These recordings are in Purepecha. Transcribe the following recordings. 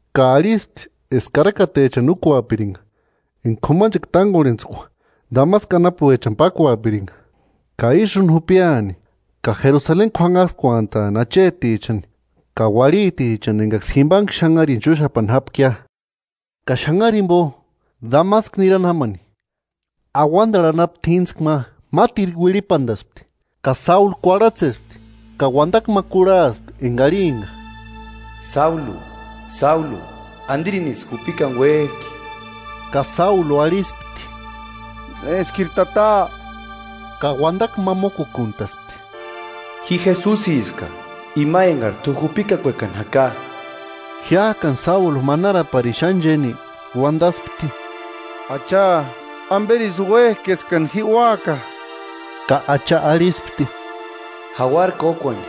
ka arhispti eska karakatechani úkuapirinka enka k'umanchekua tánkorhentskua Damasku anapuechani pákuapirinka, ka ísï úni jupiani ka Jerusaleni k'uanhaskuantaani achetichani ka uarhitichani enkaksï jimpanhe xanharini chúxapani jápkia. Ka xanhari jimpo, Damasku niárani jámani, auantarhu anapu t'íntskua ma mátirku uirhipantaspti; ka Sáulu kuarhatsespti, ka uantakua ma kurhaspti enka arhimpka: “Sáulu, Sáulu, ¿Antirinisï jupikani úek'i?” Ka Sáulu arhispti: “¿Néskiri Tata?” Ka uantakua ma mókukuntaspti: “Ji Jesusiska ima enkari t'u jupikakuekani jaka.” [Jiák'ani Sáulu manaraparini xáni chéni uantaspti: “Acha, ¿Amperisï úek'i eska ji úaka?” Ka Acha arhispti:] “Jauara kókuani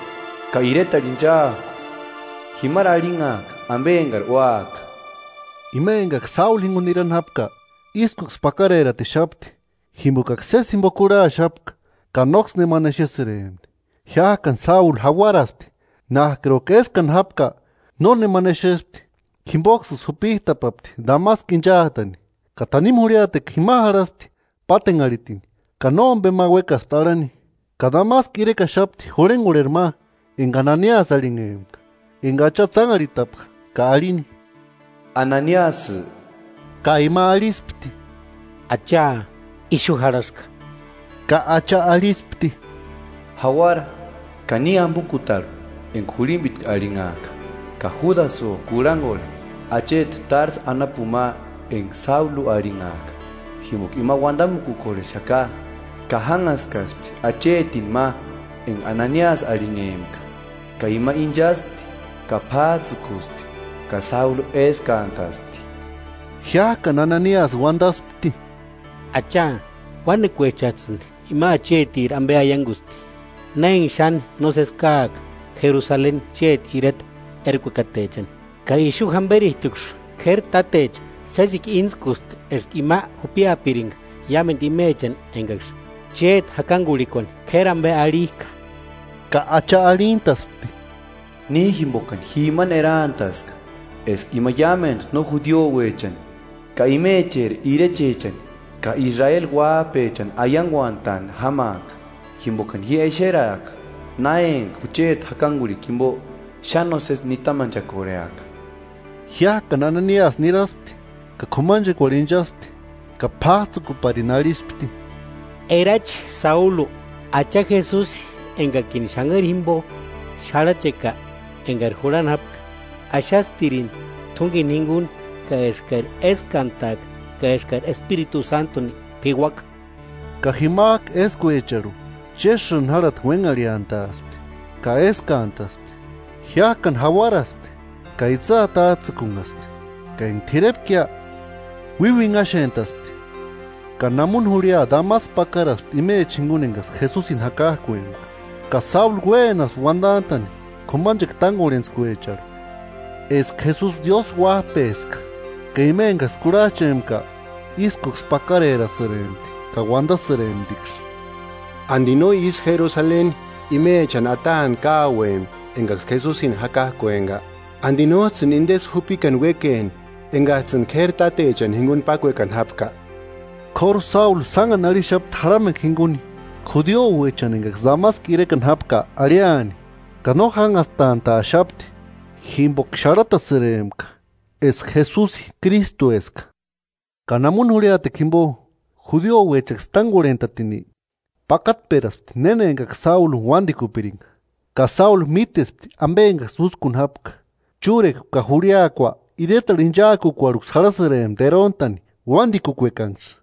ka iretarhu inchaaku, jimari arhinhaaka ampe enkari úaka.” Ima enkaksï Sáulu jinkuni nirani jápka ískuksï pákareratixapti, jimpokaksï sési jimpo kurhaxapka ka nóksï nemani exesïrempti. Jiák'ani Sáulu jauaraspti, nák'iruka éskani jápka nónemani exespti. Jimpoksïsï jupit'apapti Damasku inchaatani, ka tanimu jurhiatekua jima jarhasti pátenharhitini ka nómpe ma uékaspti arhani. Ka Damasku irekaxapti jurhenkorheri ma enka Ananiasï arhinhempka, enka Acha tsánharhitapka ka arhini: “¡Ananiasï!” Ka ima arhispti: “Acha, ixu jarhaska.” Ka Acha arhispti: “Jauara ka ni ampukutarhu enka jurhimpitku arhinhak'a, ka Júdasïo kurhankorhe acheti Társu anapuni ma enka Sáulu arhinhak'a. Jimpoka ima uantamukukorhexaka, ka jánhaskaspti achetini ma enka Ananiasï arhinhempka, ka ima ínchaspti ka p'ats'ïkusti ka Sáulu éskantaspti.” Jiák'ani Ananiasï uantaspti: “Acha, uánekuechats'ïni ima achetiri ampe aiankusti, na enka xáni nósesi káaka Jerusaleni chéti ireta erakukatechani. Ka ixu jamperit'uksï k'éri tátecha sésekua íntskusti eska ima jupiapirinka iámentu imechani enkaksï chéti jakankurhikuani k'éri ampe arhik'a.” Ka Acha arhintaspti: “Ni jimpokani ji imani eraantaska eska ima iámentu no judiuechani ka imecheri irechechani ka Israeli uáp'echani aiankuantaani jámaaka, jimpokani ji exeraaka na enka jucheti jakankurhikua jimpo xáni nósesi nitamanchakorheaka.” Jiák'ani Ananiasï niraspti ka k'umachekuarhu inchaspti ka p'áts'ïkuparini arhispti: –Erachi Sáulu, Acha Jesusi enkakini xanhari jimpo xarhacheka enkari jurhani jápka, axastirini t'únkeni jinkuni ka eskari éskantaaka ka eskari Espiritu Sántuni p'iuaka. Ka jimak'u éskuecharhu chésïni járhati uénharhiantaaspti ka éskantaspti. Jiák'ani jauaraspti ka itsï atats'ïkunhaspti. Ka enka t'irepkia, uíuinhaxént'aspti ka namuni jurhia Damasku pákaraspti imecha jinkuni enkaksï Jesusini jakak'uempka. Ka Sáulu uénaspti uantant'a'ni k'umanchekua tánkorhentskuecharhu eska Jesusi Diósï Uáp'eska. Ka ima enkaksï kurhach'empka ískuksï pakarerasïrempti ka uantasïremptiksï: –¿Anti no ísï Jerusaleni imechani ataani káuempki enkaksï Jesusini jakak'uempka? ¿Anti nóts'ïni intesï jupikani uékeni enkats'ïni k'éri tátechani jinkuni pákuekani jápka? K'óru Sáulu sánhani arhixapti jarhamekua jinkuni judiuechani enkaksï Damasku irekani jápka arhiani, ka no jánhastant'a'axapti jimpoka xarhatasïrempka eska Jesusi Krístueska. Ka namuni jurhia jimpo, judiouechaksï tánkorhent'atini, pakatperaspti néna enkaksï Sáuluni uantikupirinka, ka Sáulu mítespti ampe enkaksï úskuni jápka. Chúrekua ka jurhiakua iretarhu inchaakukuarhuksï jarhasïrempti eront'ani uantikuekanksï,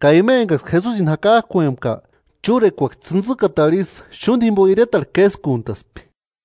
ka ima enkaksï Jesusini jakak'uempka chúrekuaksï tsïntsïkatarhu isï xúnti jimpo iretarhu késkuntaspti.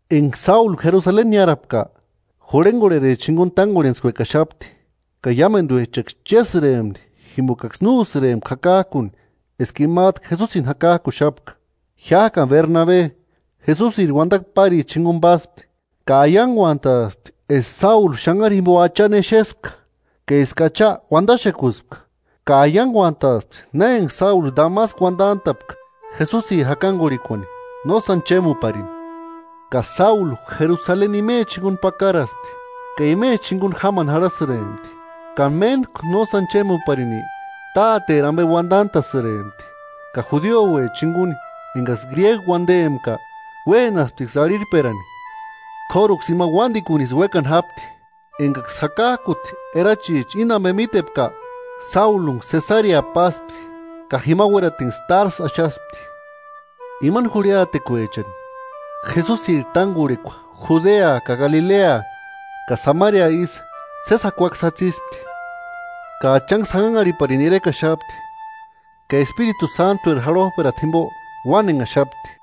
Enka Sáulu Jerusaleni niárapka, jurhenkorhericha jinkuni tánkorhentskuekaxapti ka iámentuechaksï chérhesïrempti jimpokaksï no úsïrempka jakak'uni eska imat'u Jesusini jakak'uxapka. Jiák'ani Bernabe, Jesusiri uantakua páricha jinkuni páspti, ka aiankuant'aspti eska Sáulu xanhari jimpo Achani exespka, ka eska Acha uantaxekuspka, ka aiankuant'aspti na enka Sáulu Damasku uantant'a'pka Jesusiri jakankurhikuani nósani chémuparini. Ka Sáulu Jerusaleni imecha jinkuni pákaraspti ka imecha jinkuni jámani jarhasïrempti. Ka méntku nósani chémuparini Táteri ampe uantant'a'sïrempti, ka judiouecha jinkuni enkaksï gríegu uantempka, uénasptiksï arhirhperani, k'óruksï ima uántikunisï uékani jápti. Enkaksï jakak'uti erachicha íni ampe mítepka, Sáulunksï Sesarea páspti ka jima uératinksï Társu axaspti. Imani jurhiatekuechani, Jesusiri tánkorhekua Judea ka Galilea ka Samaria ísï sési jakuaksï jatsispti, ka Achanksï janhanharhiparini irekaxapti ka Espiritu Sántueri jarhop'erata jimpo uánenhaxapti.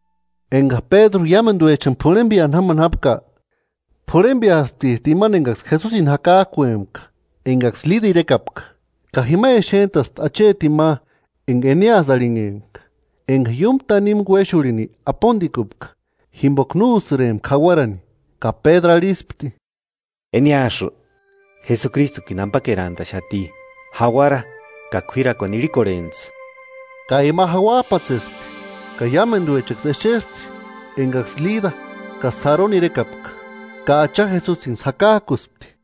Enka Pédru iámentuechani p'urhempeani jamani jápka, p'urhempeasptit'u imani enkaksï Jesusini jakak'uempka enkaksï Lida irekapka. Ka jima exent'aspti achetini ma enka Eneasï arhinhempka, enka iúmu tanimu uéxurhini apontikupka, jimpoka no úsïrempka jauarani. Ka Pédru arhispti: –Eneasï, Jesukristukini ampakerantaxati, jauara ka k'uírakuani irhikorhentsï. Ka ima jauap'atsespti. Ka iámentuechaksï exespti enkaksï Lida ka Saroni irekapka, ka Acha Jesusinksï jakak'uspti.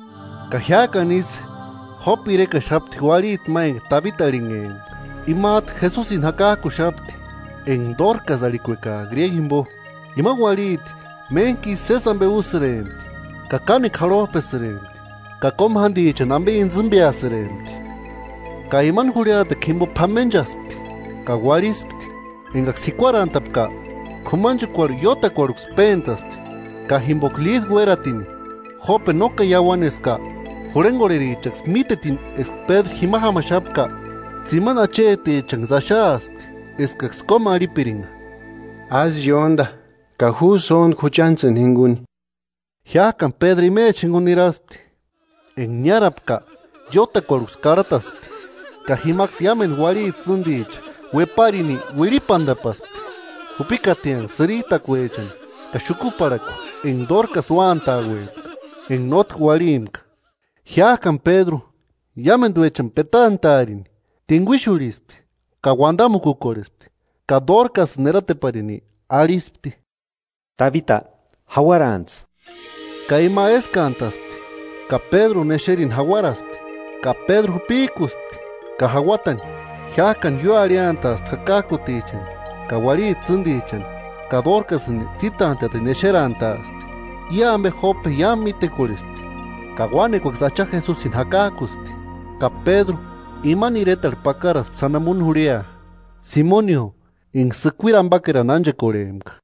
Ka jiák'ani ísï Jópe irekaxapti uarhiti ma enka Tabita arhinhempka, imat'u Jesusini jakak'uxapti (“Enka Dórkasï” arhikuekak'a gríego jimpo). Ima uarhiti méntkisï sési ampe úrisïrempti ka kánekua jarhop'esïrempti, ka kómu jántichani ampe intsïmpeasïrempti. Ka imani jurhiatekua jimpo p'amenchaspti ka uarhispti. Enkaksï jikuarantapka, k'umanchekuarhu iótakuarhuksï péntaspti. Ka jimpoka Lida uératini Jópe no káni iauaneska, jurhenkorherichaksï mítetini eska Pédru jima jámaxapka, tsimani achetichanksï axaaspti eskaksï kómarhipirinka: “Ásï iónta ka ju sóntku juchantsïni jinkuni.” Jiák'ani Pédru imecha jinkuni niraspti. Enka niárapka iótakuarhuksï karhataspti, ka jimaksï iámentu uarhiti tsînticha ueparini uirhipantapaspti jupikatianksï sïritakuechani ka xukuparhakua enka Dórkasï úkuantauempka enka nótki uarhimpka. Jiák'ani Pédru iámentuechani petant'a'arini, tinkuixurhispti ka uantamukukorhespti, ka Dórkasïni erateparini arhispti: “¡Tabita, jauarantsï!” Ka ima éskantaspti ka Pédruni exerini jauaraspti, ka Pédru jupik'uspti ka jauatani; jiák'ani ióarhiantaaspti jakak'utichani ka uarhiti tsîntichani ka Dórkasïni tsítant'a'tini exerantaaspti. I ampe Jópe iámu mítekorhespti, ka uánekuaksï Acha Jesusini jakak'uspti. Ka Pédru imani iretarhu pakaraspti sáni namuni jurhia, Simonio enka sïkuiri ampakerani ánchekorhempka.